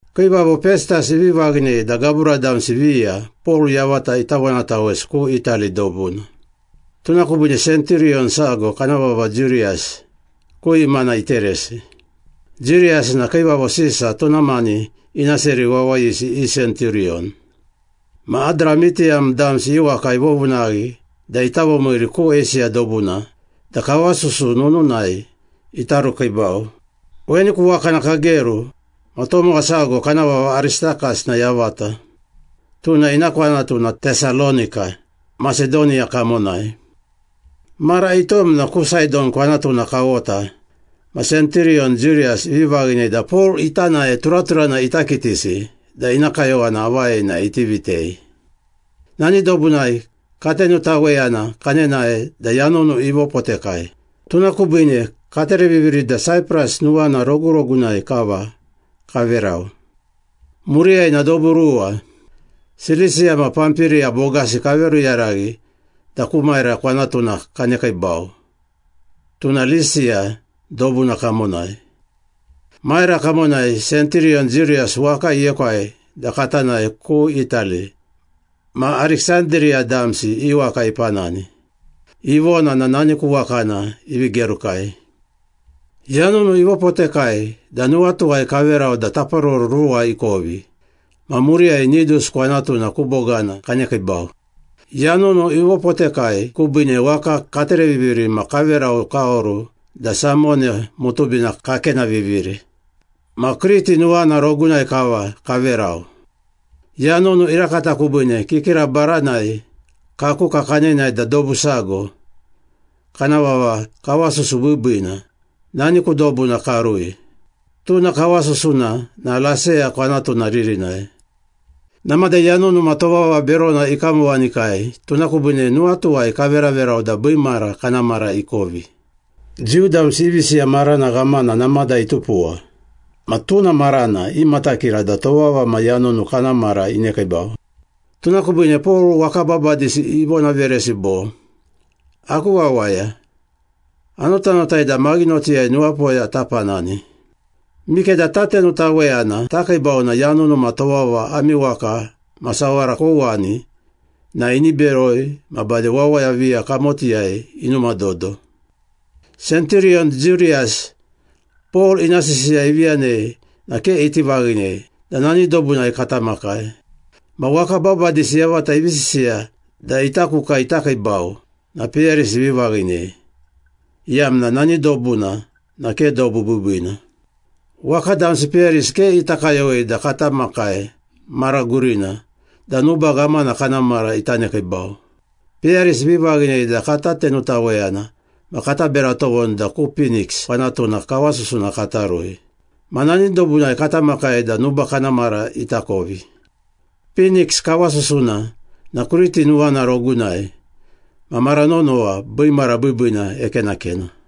Kiivavo Pestas ivi vaghinei da gabura damsi viya Pol yavata ita vonatawesi ku Itali dobuna. Tuna kubiine senturiyon sago kana vava Jiuriyas, ku imana iteresi. Jiuriyas na Kiivavo Sisa tuna mani ina seri wawayisi i senturiyon. Ma Adramitiyam damsi i waka ivovunaghi da ita vomiiri ku Eisiya dobuna da kawasusu nununai ita rukiibau. Weni ku wakana kageru ma tomowa sago, kana vava Aristakas na yavata. Tuna ina kwanatu na Tesalonika, Masedoniya kamonai. Mara itom na ku Saidon kwanatuna kawota ma senturiyon Jiuriyas ivi vaghinei da Pol ita nae turaturana ita kitisi da ina kayowana avai na iti vitei. Nani dobunai katenutaweyana kanenae da yanunu ivopotekai, tuna kubiine katereviviri da Saipras nuwana rogurogunai kava kaverau. Muriyai na dobu ruwa, Silisiya ma Pampiriya bogasi kaveruyaraghi da ku Maira kwanatuna kanekiibau, tuna Lisiya dobuna kamonai. Maira kamonai senturiyon Jiuriyas waka iekwai da kata nae ku Itali ma Ariksandiriya damsi i waka ipanani. Ivona na nani ku wakana ivi gerukai. Yanunu ivopotekai da nuwatuwai kaverau da taparoro ruwa ikovi ma muriyai Nidus kwanatuna ku bogana kanekiibau. Yanunu ivopotekai kubiine waka katereviviri ma kaverau kaoru da Samone mutubina kakenaviviri. Ma Kriti nuwana rogunai kava kaverau. Yanunu irakata kubiine kikira baranai kakuka kanenae da dobu sago, kana vava Kawasusu Biibiina, nani ku dobuna karui. Tuna kawasusuna na Laseya kwanatuna ririnai. Namada yanunu ma tovava berona ikamowanikai tuna kubiine nuwatuwai kaveraverau da biimara kana mara ikovi. Jiu damsi i visiya marana ghamana namada itupuwa ma tuna marana imatakira da tovava ma yanunu kana mara inekiibau. Tuna kubiine Pol waka babadisi ivonaveresi bo, “Aku wawaya, anotanotai da maghinotiyai nuwapoya tapanani. Mikeda tatenutaweyana takiibau na yanunu ma tovava ami waka ma sawara kouwani na ini beroi ma bade wawaya viya kamotiyai inumadodo.” Senturiyon Jiuriyas, Pol ina sisiya ivi yanei na ke iti vaghinei da nani dobunai kata makai. Ma waka babadisi yavata ivi sisiya da ita kuka ita kiibau na peyarisi ivi vaghinei, iyamna nani dobuna na ke dobu biibiina. Waka damsi peyarisi ke ita kayowei da kata makai mara gurina da nuba ghamana kana mara ita nekiibau. Peyarisi ivi vaghinei da kata tenutaweyana ma kata bera tovoni da ku Piniks kwanatuna kawasusuna kata rui. Ma nani dobunai kata makai da nuba kana mara ita kovi. Piniks kawasusuna na Kriti nuwana rogunai ma mara nonowa biimara biibiina ekenakena.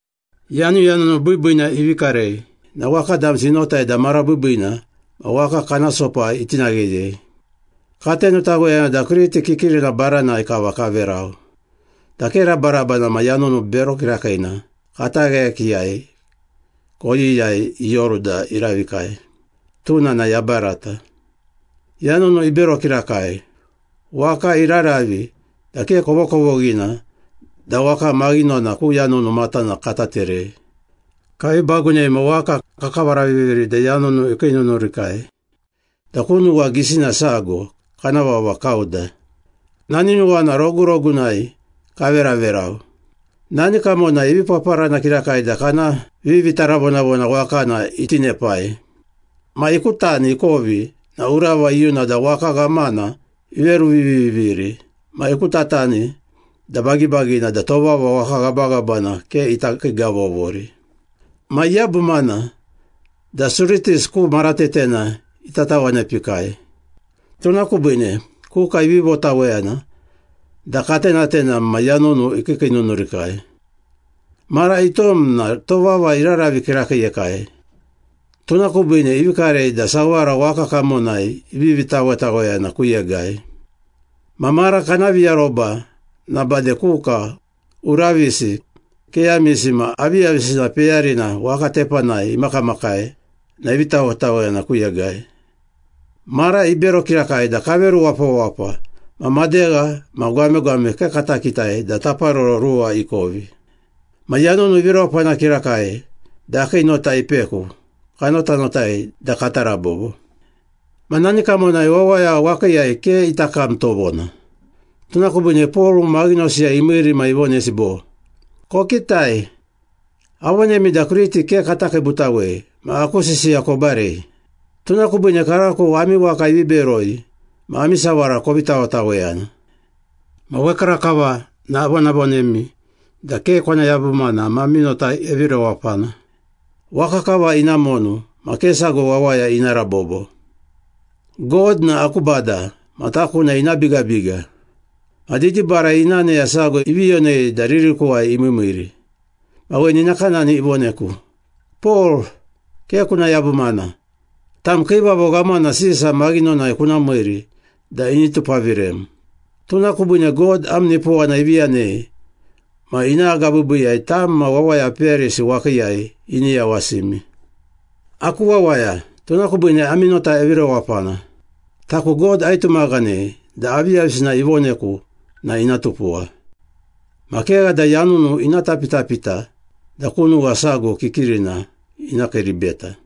Yanuyanunu biibiina ivi karei na waka damsi inotai da mara biibiina ma waka kana sopa itinagheyei. Katenutaweyana da Kriti kikirina baranai kava kaverau, da ke rabaraba ma yanunu bero kirakiina katagheyakiiyai koyiyai ioru da iravikai. Tuna na yabarata. Yanunu ibero kirakai, waka iraravi da ke kovokovoghina da waka maghinona ku yanunu matana kata terei. Kavi bagunei ma waka kakavaraviviri da yanunu ikiinunurikai da ku nuwa gisina sago, kana vava Kauda. Nani nuwana rogurogunai kaveraverau. Nani kamonai ivi paparana kirakai da kana vivitaravonavona wakana itinepai. Ma ikutani ikovi na urava iyuna da waka ghamana iveruviviviri ma ikutatani da bagibagina da tovava waka ghabaghabana ke ita kiigavovori. Ma iyabumana da Suritis ku maratetena ita tawanepikai. Tuna kubiine kuka ivi votaweyana da katenatenam ma yanunu ikiikiinunurikai. Mara itom na tovava iraravi kirakiiyekai, tuna kubiine ivi karei da sawara waka kamonai ivivi tawetaweyana ku yegai. Ma mara kana viaroba na bade kuka, uravisi, keyamisi ma aviyavisina peyarina waka tepanai imakamakai na ivi tawetaweyana ku yegai. Mara ibero kirakai da kaveru wapawapa ma madegha ma gwamegwame ke kata kitai da taparoro ruwa ikovi. Ma yanunu ivi rewapana kirakai da akii nota ipeku, kanotanotai da kata rabobo. Ma nani kamonai wawaya wakiiyai ke ita kam tovona. Tuna kubiine Pol maghinosiyai imiiri ma ivonesi bo, “Kokitai, avonemi da Kriti ke kata kiibutawei ma aku sisiya kobarei. Tuna kubiine karako ami waka ivi beroi ma ami sawara kovi tawetaweyana. Ma wekarakava na avonavonemi da ke kona yabumana ma ami nota evi rewapana. Waka kava ina monu ma ke sago wawaya ina rabobo. God na aku Bada ma taku na ina bigabiga. Ma didibarai ina aneya sago ivi yonei da ririkuwai imiimiiri, ma weni nakanani ivoneku, ‘Pol, ke kuna yabumana. Tam Kiivavo Ghamana Sisa maghinonai kuna miiri da ini tupavirem. Tuna kubiine God am nipowana ivi yanei ma ina agabiibiiyai tam ma wawaya peyarisi wakiiyai ini yawasimi.’ Aku wawaya, tuna kubiine ami nota evi rewapana. Taku God aitumaghanei da aviyavisina ivoneku na ina tupuwa. Ma kegha da yanunu ina tapitapita da ku nuwa sago kikirina ina kiiribeta.”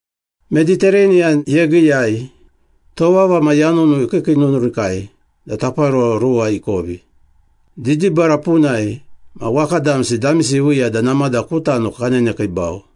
Meditereniyan Yegiiyai tovava ma yanunu ikiikiinunurikai da taparoro ruwa ikovi. Didibara punai ma waka damsi damisi iviiya da namada ku tano kanenekiibau.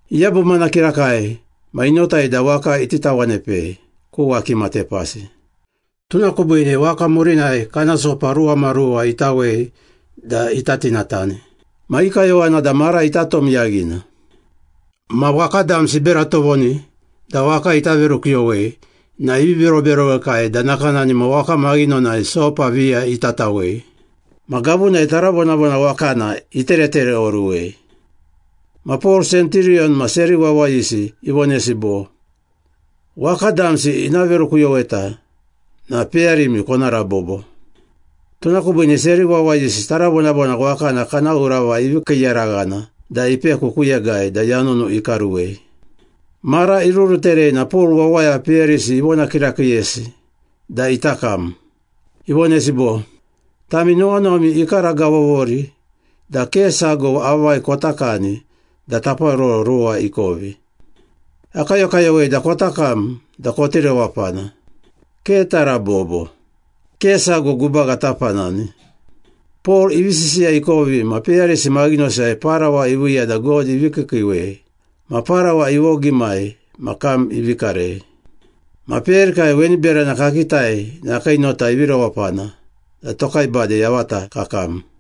Iyabumana kirakai ma inotai da waka iti tawanepei ku wakima tepasi. Tuna kubiine waka murinai kana sopa ruwamaruwa itawei da ita tinatani. Ma i kayowana da mara ita tom yaghina. Ma waka damsi ibera tovoni da waka ita verukuyowei na ivi beroberowekai da nakanani ma waka maghinonai sopa viya ita tawei. Ma gavunai taravonavona wakana iteretereoruwei. Ma Pol senturiyon ma seri wawayisi ivonesi bo, “Waka damsi ina verukuyoweta na peyarimi kona rabobo.” Tuna kubiine seri wawayisi taravonavona wakana kana urava ivi kiiyaraghana da ipeku ku yegai da yanunu ikaruwei. Mara iruruterei na Pol wawaya peyarisi ivona kirakiiyesi da ita kam. Ivonesi bo, “Tami nuwanuwami ikaragavovori da ke sago avai kota kani da taparoro ruwa ikovi. Akayokayowei da kota kam da koti rewapana. Ke tarabobo. Ke sago gubaga tapanani.” Pol ivi sisiya ikovi ma peyarisi maghinosiyai parawa iviiya da God ivi kiikiiwei ma parawa ivogimai ma kam ivi karei. Ma peyarikai weni berana kakitai na akii nota ivi rewapana da tokai bade yavata kakam.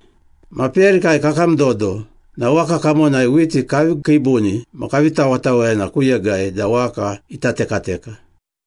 Ma peyarikai kakam dodo na waka kamonai whiti kavi kiibuni ma kavi tawetaweyana ku yegai da waka ita tekateka.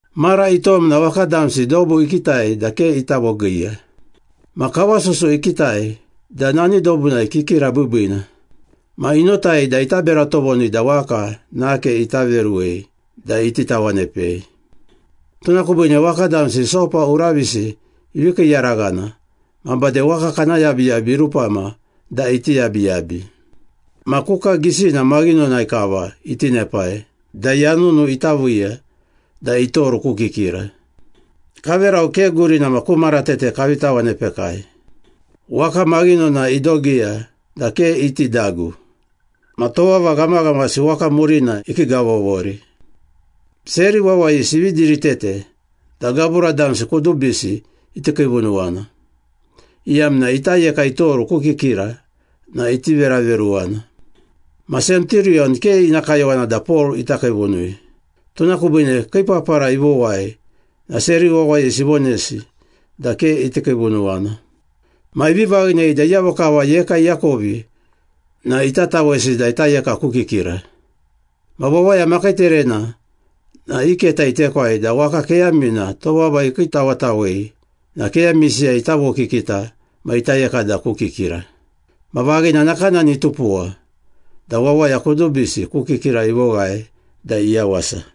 Mara itom na waka damsi dobu ikitai da ke ita vogiiya. Ma kawasusu ikitai da nani dobunai kikira biibiina. Ma inotai da ita bera tovoni da waka nake ita veruwei da iti tawanepei. Tuna kubiine waka damsi sopa uravisi ivi kiiyaraghana ma bade waka kana yabiyabi irupama da iti yabiyabi. Ma kuka gisina maghinonai kava itinepai da yanunu ita viiya da itoru ku kikira. Kaverau ke gurina ma ku maratete kavi tawanepekai. Waka maghinona idogiya da ke iti dagu, ma tovava ghamaghamasi waka murina ikiigavovori. Seri wawayisi ivi diritete da gabura damsi kudubisi iti kiivunuwana, iyamna ita yeka itoru ku kikira na iti veraveruwana. Ma senturiyon ke ina kayowana da Pol ita kiivunui. Tuna kubiine kii papara ivowai na seri wawayisi ivonesi da ke iti kiivunuwana. Ma ivi vaghinei da iyavo kava yeka iakovi na ita tawesi da ita yeka ku kikira. Ma wawaya makiiterena na i keta itekwai da waka keyamina tovava ikiitawetawei na keyamisiyai ita vokikita ma ita yeka da ku kikira. Ma vaghina nakanani itupuwa da wawaya kudubisi ku kikira ivoghae da iyawasa.